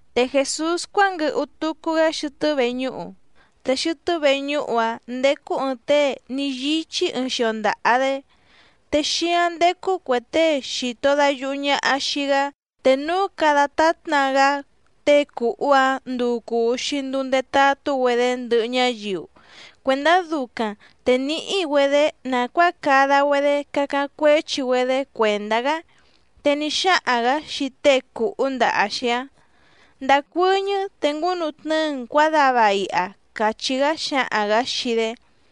Te Jèsús cuánguɨhu tucu‑gá xɨtɨ́ veñúhu, te xɨtɨ́ veñúhu‑áⁿ ndécú ɨ̀ɨⁿ tée ní yíchí ɨɨⁿ xio ndaha‑dé. Te xíáⁿ ndécú cuè tée xìto dayuhu ñaha xii‑gá, te núu cada tátna‑gá tée cùhú‑áⁿ nduu cùu‑xi nduu ndetatú‑güedé ndɨhɨ ñáyiu, cuèndá ducaⁿ te níhí‑güedě nàcuáa cada‑güedé cacáⁿ cuéchi‑güedé cuèndá‑gá. Te ní xáhaⁿ‑gǎ xii tée cùhú ndaha‑xi‑áⁿ: —Ndacuɨ́ñɨ́ te ngúnutnɨ́ɨ‑n cuǎdava iha —càchí‑gá xǎhaⁿ‑gǎ xii‑dé.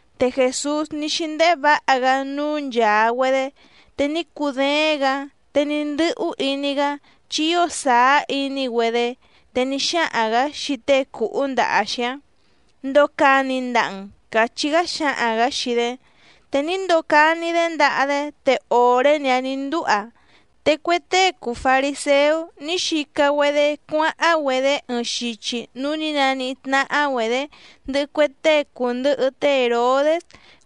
Te Jèsús ní xíndéhé vǎha‑gá núú nchàa‑güedé te ní cudééⁿ‑gǎ, te ní ndɨ́hú iní‑gá chi ío sàá iní‑güedé, te ní xáhaⁿ‑gǎ xii tée cùhú ndaha‑xi‑áⁿ: —Ndocani ndaha‑n —càchí‑gá xǎhaⁿ‑gǎ xii‑dé. Te ní ndocani‑dé ndaha‑dé, te òré‑ni‑áⁿ nǐ ndúha. Te cue tée cùu fariséú ní xica‑güedé cuáháⁿ‑güedé ɨɨⁿ xichi núú nǐ naníhí tnáhá‑güedě ndɨhɨ cue tée cùndɨhɨ té Hèrodés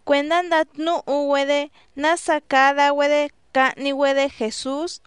cuèndá ndatnúhu‑güedé nása cada‑güedé cahni‑güedé Jèsús.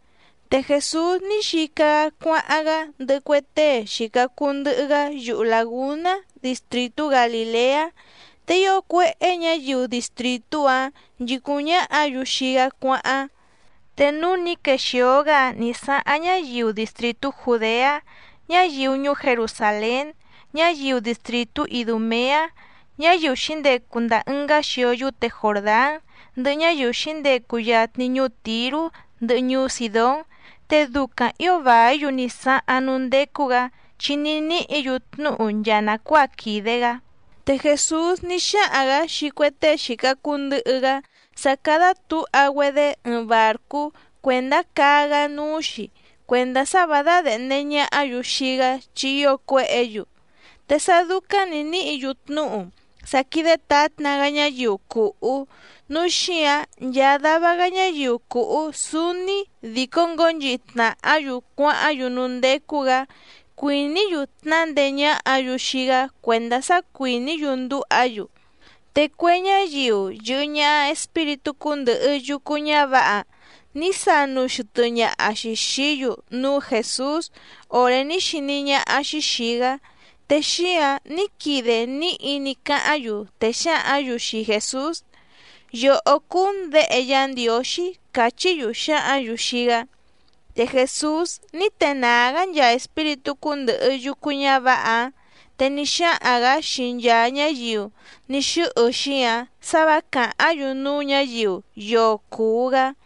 Te Jèsús ní xica‑gá cuáháⁿ‑gá ndɨhɨ cue tée xìca cuu ndɨhɨ‑gá yuhu làgúná distrìtú Galìleá, te ío cuéhé ñǎyiu distrìtú‑áⁿ nchìcúⁿ ñáhǎ‑yu xii‑gá cuáháⁿ. Te núú nǐ quexìo‑gá‑áⁿ nǐ sáháⁿ ñáyiu distrìtú Jùdeá, ñáyiu ñuú Jerusàlén, ñáyiu distrìtú Idùmeá, ñáyiu xǐndecu ndàa ɨngá xio yúte Jòrdán, ndɨhɨ ñáyiu xǐndecu yatni ñuú Tìrú ndɨhɨ ñuú Sìdón, te ducaⁿ ǐo vàí‑yu ní sáháⁿ núú ndécú‑gǎ chi ní níhǐ‑yu tnúhu nchaa nàcuáa quìde‑gá. Te Jèsús ní xáhaⁿ‑gǎ xii cue tée xìca cuu ndɨhɨ‑gá sá cádá tǔha‑güedé ɨɨⁿ bàrcú cuèndá caa‑gá núú‑xi cuèndá sá vǎ dádèhnde ñahá‑yu xii‑gá chi ío cuéhě‑yu. Te sá dúcáⁿ nǐ níhǐ‑yu tnúhu sá quídé tǎtna‑gá ñáyiu cùhú, núu xíǎⁿ nchaa dava‑gá ñáyiu cùhú súúní dìcó ngǒnchihi tnàhá‑yu cuáháⁿ‑yu núú ndécú‑gǎ cuìní‑yu tnándeé ñáhǎ‑yu xii‑gá cuèndá sá cuìní‑yu ndúha‑yu. Te cue ñáyiu yɨ̀hɨ ñaha espíritú cúndɨ̀hɨ yucu ñávǎha ní sanu xɨtɨ ñàha‑xi xií‑yu núú Jèsús òré ní xiní ñáhá‑xí xìi‑gá, te xíǎⁿ ní quide níhi ní cáháⁿ‑yu, te xǎhǎⁿ‑yu xii Jèsús: —¡Yòhó cúú‑n Děhe Yá Ndiǒxí! —càchí‑yu xǎhǎⁿ‑yu xii‑gá. Te Jèsús ní tenàá‑gá nchaa espíritú cúndɨ̀hɨ yucu ñávǎha‑áⁿ, te ní xáhaⁿ‑gǎ xii nchaa ñáyiu ní xɨ́hɨ‑xi‑áⁿ sǎ vǎ càháⁿ‑yu núú ñǎyiu yoo cùu‑gá.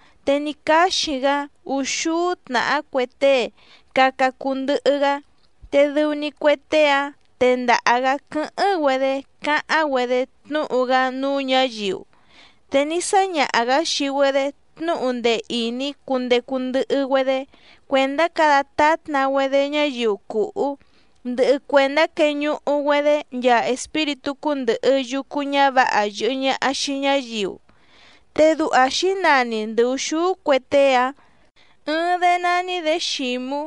te ní cáxi‑gá úxúú tnàhá cue tée caca cuu ndɨhɨ‑gá, te dɨu‑ni cue tée‑áⁿ tendaha‑gǎ quɨ́hɨ́ⁿ‑güedé cáháⁿ‑güedé tnúhu‑gá núú ñǎyiu. Te ní sáñaha‑gǎ xii‑güedé tnúhu ndee ìní cundecu ndɨhɨ‑güedé cuèndá cada tátna‑güedé ñáyiu cùhú, ndɨhɨ cuèndá queñuhu‑güedé nchaa espíritú cúndɨ̀hɨ yucu ñávǎha yɨ̀hɨ ñaha xii ñáyiu. Te duha xǐnani ndɨ ùxúú cue tée‑áⁿ: Ɨɨⁿ‑dé nání‑dě Xǐmú,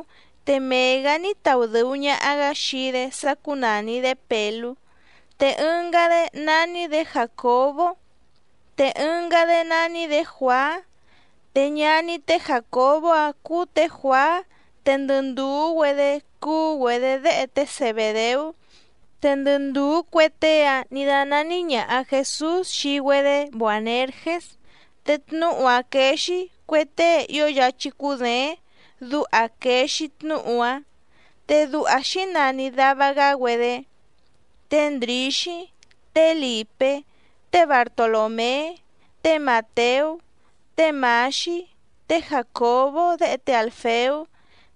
te mee‑gǎ ní taudɨ̀u ñaha‑gá xii‑dé sá cúnàni‑dé Pèlú. Te ɨngá‑dé nání‑dě Jàcobó, te ɨngá‑dé nání‑dě Juàá, te ñaní té Jàcobó‑áⁿ cúú tě Juàá te ndɨ ndùú‑güedé cúú‑güedě déhe té Zebèdeú, te ndɨ ndùú cue tée‑áⁿ nǐ dánání ñàha Jesús xii‑güedé Boànergés, te tnúhu‑áⁿ quéé‑xí: Cue tée ío yáchí cúděéⁿ, duha quèe‑xi tnúhu‑áⁿ. Te duha xǐnani dàva‑gá‑güedé: Té Ndrǐxí, té Lìpé, té Bartolòmé, té Màteú, té Mǎxí, té Jàcobó déhe té Àlfeú,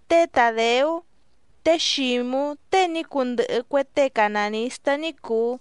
té Tàdeú, té Xǐmú tée ní cundɨhɨ cue tée canànistá ní cùu,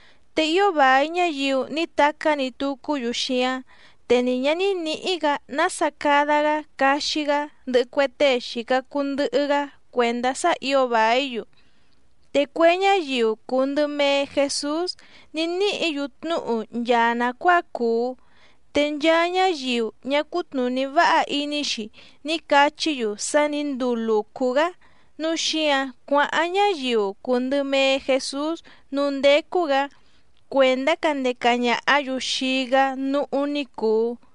Te ío vài ñáyiu ní tacá‑ni tucú‑yu xíáⁿ, te ni ñǎ ní nǐhí‑gǎ nása cada‑gá caxi‑gá ndɨhɨ cue tée xìca cuu ndɨhɨ‑gá cuèndá sá ǐo vàí‑yu. Te cue ñáyiu cùu ndɨ mee Jesús ní níhǐ‑yu tnúhu nchaa nàcuáa cùu, te nchaa ñáyiu ñá cùtnuní váha iní‑xi ní cachí‑yu sá nǐ nduu lùcú‑gá nǔu xíǎⁿ cuáháⁿ ñáyiu cùu ndɨ mee Jesús núú ndécú‑gǎ cuèndá candeca ñàhá‑yu xii‑gá núhú ní cùu.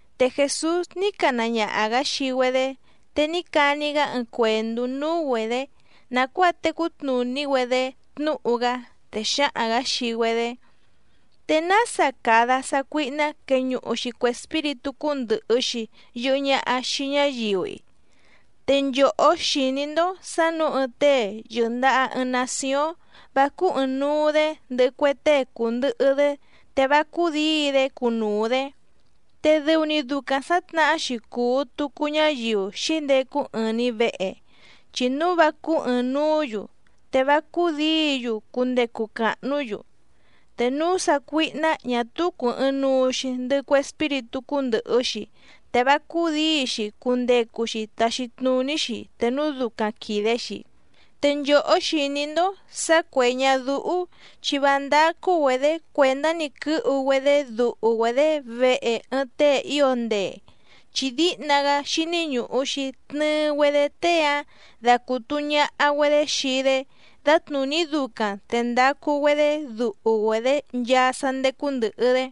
Te Jèsús ní cana ñaha‑gǎ xii‑güedé, te ní cani‑gá ɨɨⁿ cuèndú núú‑güedě nàcuáa tecú tnùní‑güedé tnúhu‑gá, te xǎhaⁿ‑gǎ xii‑güedé: —¿Te nása cada sácuíhná queñuhu‑xi cue espíritú cúndɨ̀hɨ‑xi yɨhɨ ñaha xii ñáyiu‑i? Te nchòhó xìní‑ndó sǎ nǔu ɨɨⁿ tée yɨ̀ndaha ɨɨⁿ nacióⁿ vá cúú ɨ̀ɨⁿnuu‑dé ndɨhɨ cue tée cùndɨhɨ‑dé, te vá cúdǐi‑dé cunuu‑dě. Te dɨu‑ni ducaⁿ sǎtnahá‑xi cùu tucu ñáyiu xǐndecu ɨɨⁿ‑ni vèhe, chi núu vá cúú ɨ̀ɨⁿnuú‑yu, te vá cúdǐi‑yu cundecu càhnú‑yu. Te núu sácuíhná ñà túú cùu ɨɨⁿnuu‑xi ndɨhɨ cue espíritú cúndɨ̀hɨ‑xi, te vá cúdǐi‑xi cundecu‑xi taxi tnùní‑xi te núu ducaⁿ quìde‑xi. ’Te nchòhó xìní‑ndó sǎ cuè ñadúhú chi vá ndácú‑güedě cuèndá‑ni quɨ́hu‑güedé duhu‑güedě vehe ɨɨⁿ tée ío ndee, chi díhna‑gá xíní ñùhu‑xi tnɨɨ‑güedé tée‑áⁿ dacùtu ñaha‑güedé xii‑dé dǎtnùní ducaⁿ te ndacu‑güedé duhu‑güedě nchaa sá ndécú ndɨ̀hɨ‑dé.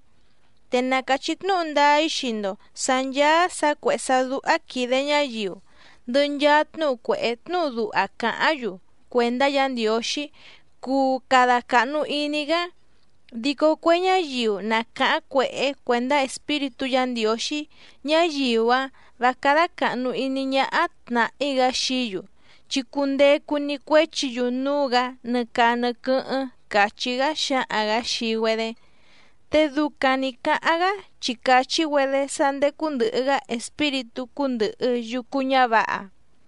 ’Te na càchí tnúhu ndáá‑í xii‑ndo sǎ ncháá sǎ cuèhé sá dúhá quìde ñáyiu, ndɨhɨ nchaa tnúhu cuèhé tnúhu duha càháⁿ‑yu cuèndá Yǎ Ndiǒxí cuu cada càhnu iní‑gá. Dico cue ñáyiu na càháⁿ cuèhé cuèndá Espíritú Yǎ Ndiǒxí, ñáyiu‑áⁿ vǎ cádá càhnu iní ñáhá tnàhí‑gá xií‑yu, chi cundecu‑ni cuéchi‑yu núú‑gǎ nɨ caa nɨ quɨ́hɨ́ⁿ —càchí‑gá xǎhaⁿ‑gǎ xii‑güedé. Te ducaⁿ nǐ cáháⁿ‑gá chi càchí‑güedé sá ndécú ndɨ̀hɨ‑gá espíritú cúndɨ̀hɨ yucu ñávǎha.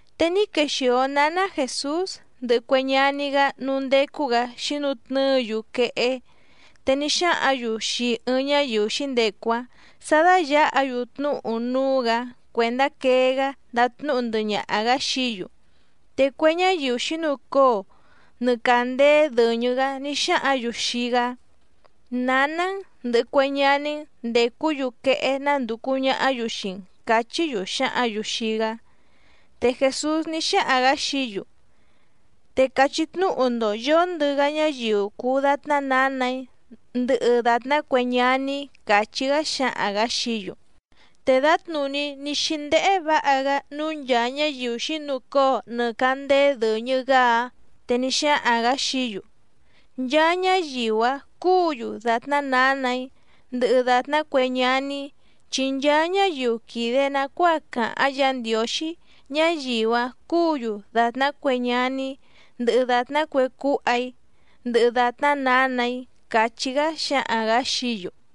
Te ní quexìo náná Jèsús ndɨhɨ cue ñaní‑gá núú ndécú‑gǎ xǐnutnɨ́ɨ‑yu quehé, te ní xáhǎⁿ‑yu xii ɨɨⁿ ñáyiu xǐndecu‑áⁿ sǎ dáyǎha‑yu tnúhu núú‑gǎ cuèndá quee‑gá ndatnúhu ndɨhɨ ñaha‑gǎ xií‑yu. Te cue ñáyiu xǐnucóo nɨ càndéé dɨ̀ñɨ‑gá ní xáhǎⁿ‑yu xii‑gá: —Nǎná‑n ndɨ̀hɨ cue ñaní‑n ndècú‑yu quehé nándùcu ñahá‑yu xii‑n —càchí‑yu xǎhǎⁿ‑yu xii‑gá. Te Jèsús ní xáhaⁿ‑gǎ xií‑yu: —Te cachí tnúhu‑ndo yǒndɨ‑gá ñáyiu cùu datná nǎnà‑í ndɨhɨ dàtná cue ñaní‑í —càchí‑gá xǎhaⁿ‑gǎ xií‑yu. Te dǎtnùní ní xíndéhé vǎha‑gá núú nchàa ñáyiu xǐnucóo nɨ càndéé dɨ̀ñɨ‑gá‑áⁿ, te ní xáhaⁿ‑gǎ xií‑yu: —Nchaa ñáyiu‑a cùú‑yu dàtná nǎnà‑í ndɨhɨ dàtná cue ñaní‑í. Chi nchaa ñáyiu quìde nacuáa càháⁿ Yǎ Ndiǒxí, ñáyiu‑áⁿ cúǔ‑yu dàtná cue ñaní‑í, ndɨhɨ dàtná cue cúha‑í, ndɨhɨ dàtná nǎnà‑í —càchí‑gá xǎhaⁿ‑gǎ xií‑yu.